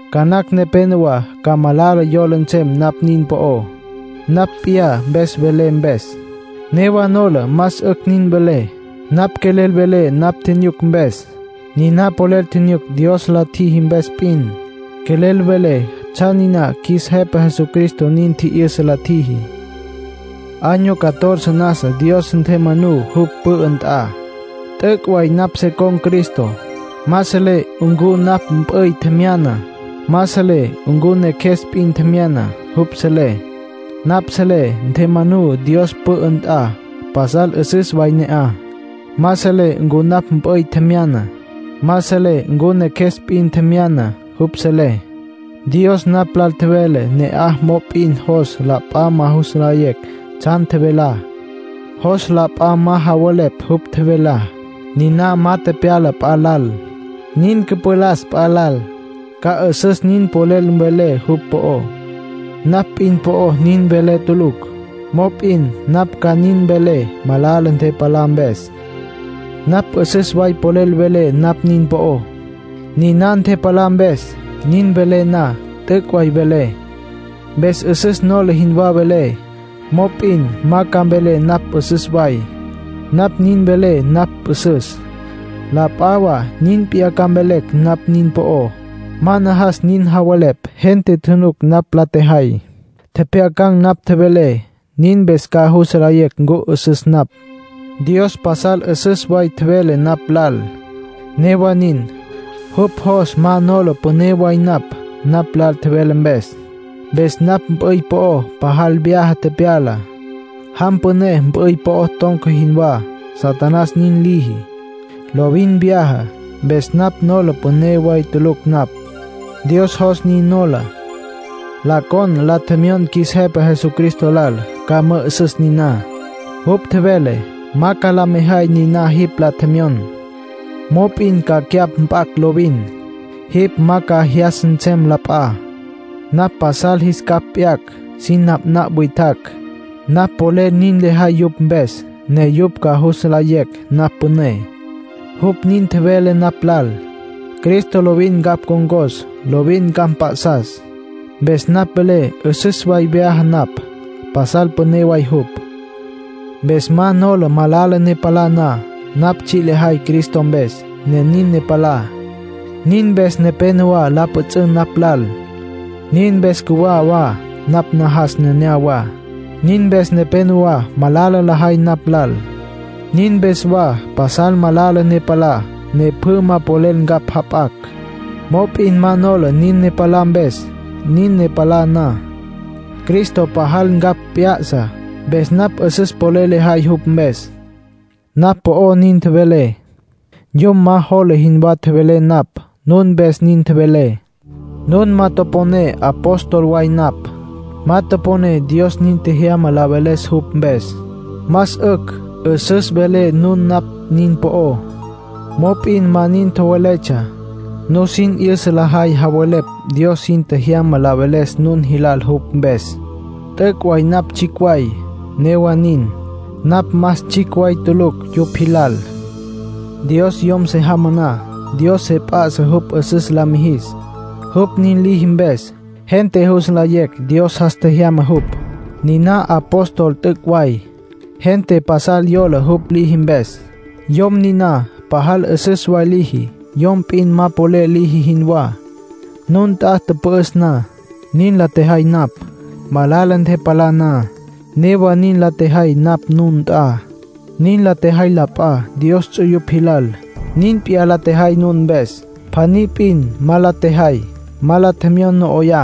Ca nacj nepénowa ca malala yola nsem napj nin po'ó, napj p'iyá mpes velé mpes. Newa nola más 'ücj nin velé. Napj quelel velé napj tjinyuc mpes, niná polel tjinyuc Dios la tjiji mpes p'in. Quelel velé tsjan niná qjuis Jepa Jesucristo nin tji'yüsa la tjiji. Año catorce nasa Dios ntjemanú jupj pü'ü nt'a. T'üc' way napj se con̈ Cristo. Ma selé ncu napj mp'üy tjemyana. Ma selé ncu neqjues p'in tjemyana. Jupj selé. Napj selé ntjemanú Dios pü'ü nt'a, pasal 'üsüs way ne'aj. Ma selé ncu napj mp'üy tjemyana. Ma selé ncu neqjues p'in tjemyana. Jupj selé. Dios napj lal tjevele ne'aj mop'in jos la p'a ma jus nlayecj tsjan tjevelá. Jos la p'a ma javelepj jupj tjevelá. Niná ma tepyala p'a lal. Nin cüpalas p'a lal, ca 'üsüs nin polel mvelé jupj po'ó; napj p'in po'o nin mvelé tulucj. Mop'in napj ca nin mvelé malala ntepalá mpes. Napj 'üsüs way polel velé napj nin po'ó, niná ntepalá mpes. Nin velé na, t'üc' way velé, mpes 'üsüs nola jinwá velé. Mop'in ma ca mvelé napj 'üsüs way. Napj nin velé napj 'üsüs, la p'a wa nin p'iyá ca mvelecj napj nin po'ó. Ma najas nin javelepj. Gente tjunuc napj la tjejay, tjepjyacan̈ napj tjevelé. Nin mpes ca jus nlayecj ncu 'üsüs napj. Dios pasal 'üsüs way tjevele napj lal. Newa nin, jupj jos ma nola püné way napj, napj lal tjevele mpes. Mpes napj mp'üy po'o pajal vyaja tepyala, jam püné mp'üy po'o ton̈ca jinwá. Satanás nin liji. Lovin vyaja. Mpes napj nola püné way tulucj napj, Dios jos nin nola. La con la tjemyon qjuis Jepa Jesucristo lal, ca mü'ü'süs niná. Jupj tjevele: “Ma ca la mejay niná jipj la tjemyon, mop'in ca cyapj mp'acj lovin. Jipj ma ca jyas nsem la p'a. Napj pasal jis capj p'yacj sin napnapj witjacj. Napj polel nin lejay yupj mpes, ne yupj ca jus nlayecj napj püné”, jupj nin tjevele napj lal. Cristo lovin ncapj ncon̈cos, lovin ncapj mp'a'sas, mpes napj velé 'üsüs way vyaja napj. Pasal püné way jupj. Mpes ma nola malala ne palá na. Napj tsji' lejay Cristo mpes, ne nin ne palá. Nin mpes nepénowa la pjüts'ün napj lal. Nin mpes cjuwá wa napj najas nenéyawa. Nin mpes nepénowa malala lajay napj lal. Nin mpes wa pasal malala ne palá, ne pjü ma polel ncapj jap'acj. Mop'in ma nola nin ne palá mpes. Nin ne palá na, Cristo pajal ncapj p'ya'sa, mpes napj 'üsüs polel lejay jupj mpes. Napj po'ó nin tjevelé. Yom ma jola jinwá tjevelé napj. Nun mpes nin tjevelé. Nun ma toponé apóstol way napj, ma toponé Dios nin tjejyama la veles jupj mpes. Más 'ücj 'üsüs welé nun napj nin po'ó, mop'in ma nin tjoweletsja. Nusin 'yüsa lajay javelepj Dios sin tjejyama la veles nun jilal jupj mpes. T'üc' way napj tsjicj way; newa nin, napj más tsjicj way tulucj yupj jilal. Dios yom se jamá na, Dios se p'a'sa jupj 'üsüs la mijis. Jupj nin liji mpes, gente jus nlayecj Dios jas tjejyama jupj. Niná apóstol t'üc' way. Gente pasal yola jupj liji mpes. Yom niná pajal 'üsüs way liji, yom p'in ma polel liji jinwá. Nun nt'a tüpü'üs na, niná la tjejay napj. Malala ntepalá na, newa nin la tjejay napj nun nt'a. Nin la tjejay la p'a Dios ts'uyupj jilal, nin p'iyá la tjejay nun mpes. Pjaní p'in ma la tjejay. Ma la tjemyon no 'oyá.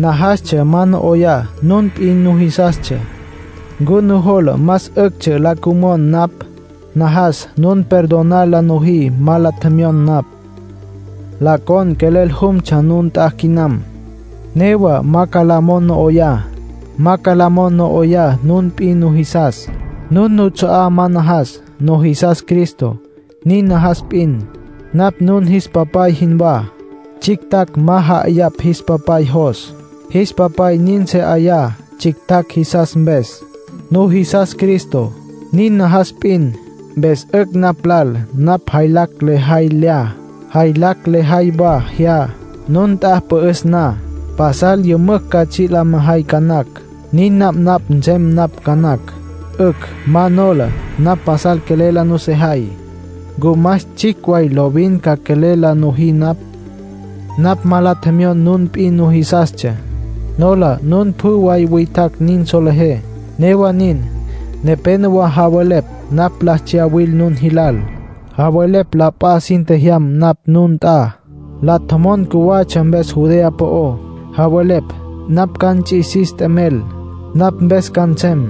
Najastsja ma no 'oyá nun p'in nujisastsja. ¿Ncu nujola más 'üctsja la cümon napj? Najas nun perdonar la nojí ma la tjemyon napj. La con quelel jumtsja nun nt'a quinam. Newa ma ca la mon no 'oyá. Ma ca la mon no 'oyá nun p'in nujisas. Nun nuts'a'á ma najas. Nujisas Cristo; nin najas p'in. Napj nun jis papay jinwá. Tsjictjacj ma ja'ayapj jis papay jos. Jis papay nin se 'aya tsjictjacj jisas mpes. Nujisas Cristo; nin najas p'in. Mpes 'ücj napj lal napj jaylacj lejay lya, jaylacj lejay wa jya, nun nt'a pü'üs na. Pasal ca yümücj tsji' la mejay ca nacj. Nin napnapj nsem napj ca nacj. 'Ücj, ma nola. Napj pasal quelel la nusejay. ¿Ncu más tsjicj way lovin ca quelel la nojí napj? Napj ma la tjemyon nun p'in nujisastsja. Nola nun pjü way witjacj nin solejé. Newa nin, nepénowa javelepj napj la tsyawil nun jilal. Javelepj la p'a sin tjejyam napj nun nt'a, la tjomon cjuwatsja mpes Judea po'ó. Javelepj napj ca nts'isis t'emel, napj mpes ca nsem.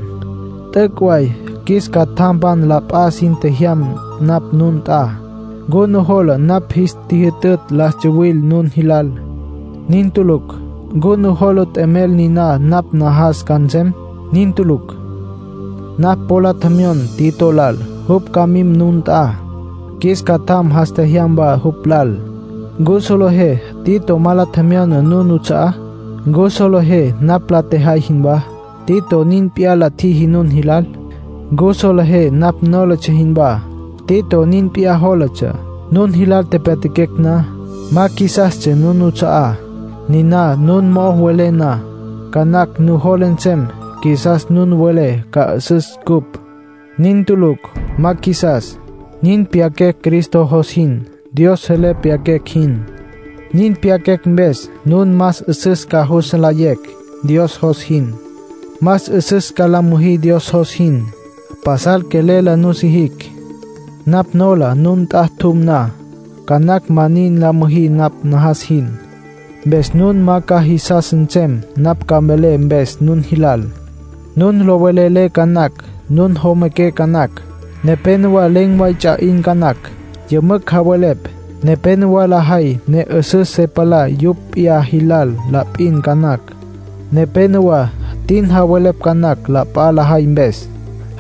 T'üc' way qjuis catjampan la p'a sin tjejyam napj nun nt'a. ¿Ncu nujola napj jis tjijyütütj la tsuwil nun jilal? Nin tulucj. ¿Ncu nujola t'emel niná napj najas ca nsem? Nin tulucj. Napj po la tjemyon Tito lal, jupj ca mim nun nt'a. Qjuis catjam jas tjejyam wa jupj lal. ¿Ncu solejé Tito ma la tjemyona nun nuts'a'á? ¿Ncu solejé napj la tjejay jinwá, Tito nin p'iyá la tjiji nun jilal? ¿Ncu solejé napj nólatsja jinwá, Tito nin p'iyá jólatsja, nun jilal tepyatjaquecj na? Ma qjuisastsja nun nuts'a'á. Niná nun mo'o welé na, ca nacj nujola nsem qjuisas nun mvelé ca 'üsüs cupj. Nin tulucj. Ma qjuisas. Nin pyaquecj Cristo jos jin, Dios selé pyaquecj jin. Nin pyaquecj mpes nun más 'üsüs ca jus nlayecj Dios jos jin, más 'üsüs ca la müjí Dios jos jin. Pasal quelel la nusijicj. Napj nola nun nt'a tjum na, ca nacj ma nin la müjí napj najas jin. Mpes nun ma ca jisas nsem napj ca mvelé mpes nun jilal. Nun lo velelé ca nacj. Nun jomaqué ca nacj. Nepénowa len̈ way ts'a 'in ca nacj, yümücj javelepj. Nepénowa lajay ne 'üsüs se palá yupj p'iyá jilal la p'in ca nacj. Nepénowa tin javelepj ca nacj la p'a lajay mpes.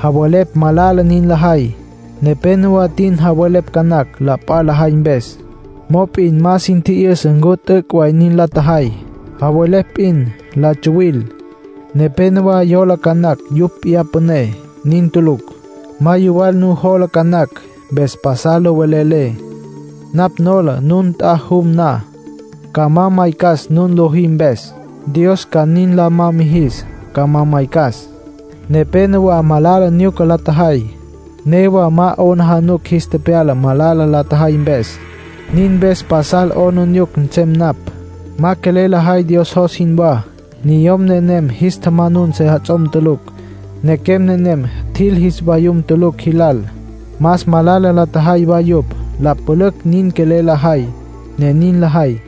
Javelepj malala nin lajay. Nepénowa tin javelepj ca nacj la p'a lajay mpes, mop'in ma sin tji'yüsa ncu t'üc' nin la tjajay. Javelepj p'in, la tsuwil. Nepénowa yola ca nacj yupj p'iyá püné. Nin tulucj. Ma yuwal nujola ca nacj, mpes pasal lo velelé. Napj nola nun nt'a jum na, ca ma maycas nun lojí mpes. Dios ca nin la ma mijis ca ma maycas. Nepénowa malala nyuca la tjajay, newa ma 'aplijila jis tepyala malala la tjajay mpes; nin mpes pasal 'aplijila nsem napj. Ma quelel lajay Dios jos jinwá. Niyom nenem jis tjamanun sejats'om tulucj. Nequem nenem tjil jis vayum tulucj jilal. Más malala la tjajay wa yupj. La pülücj nin quelel lajay, ne nin lajay.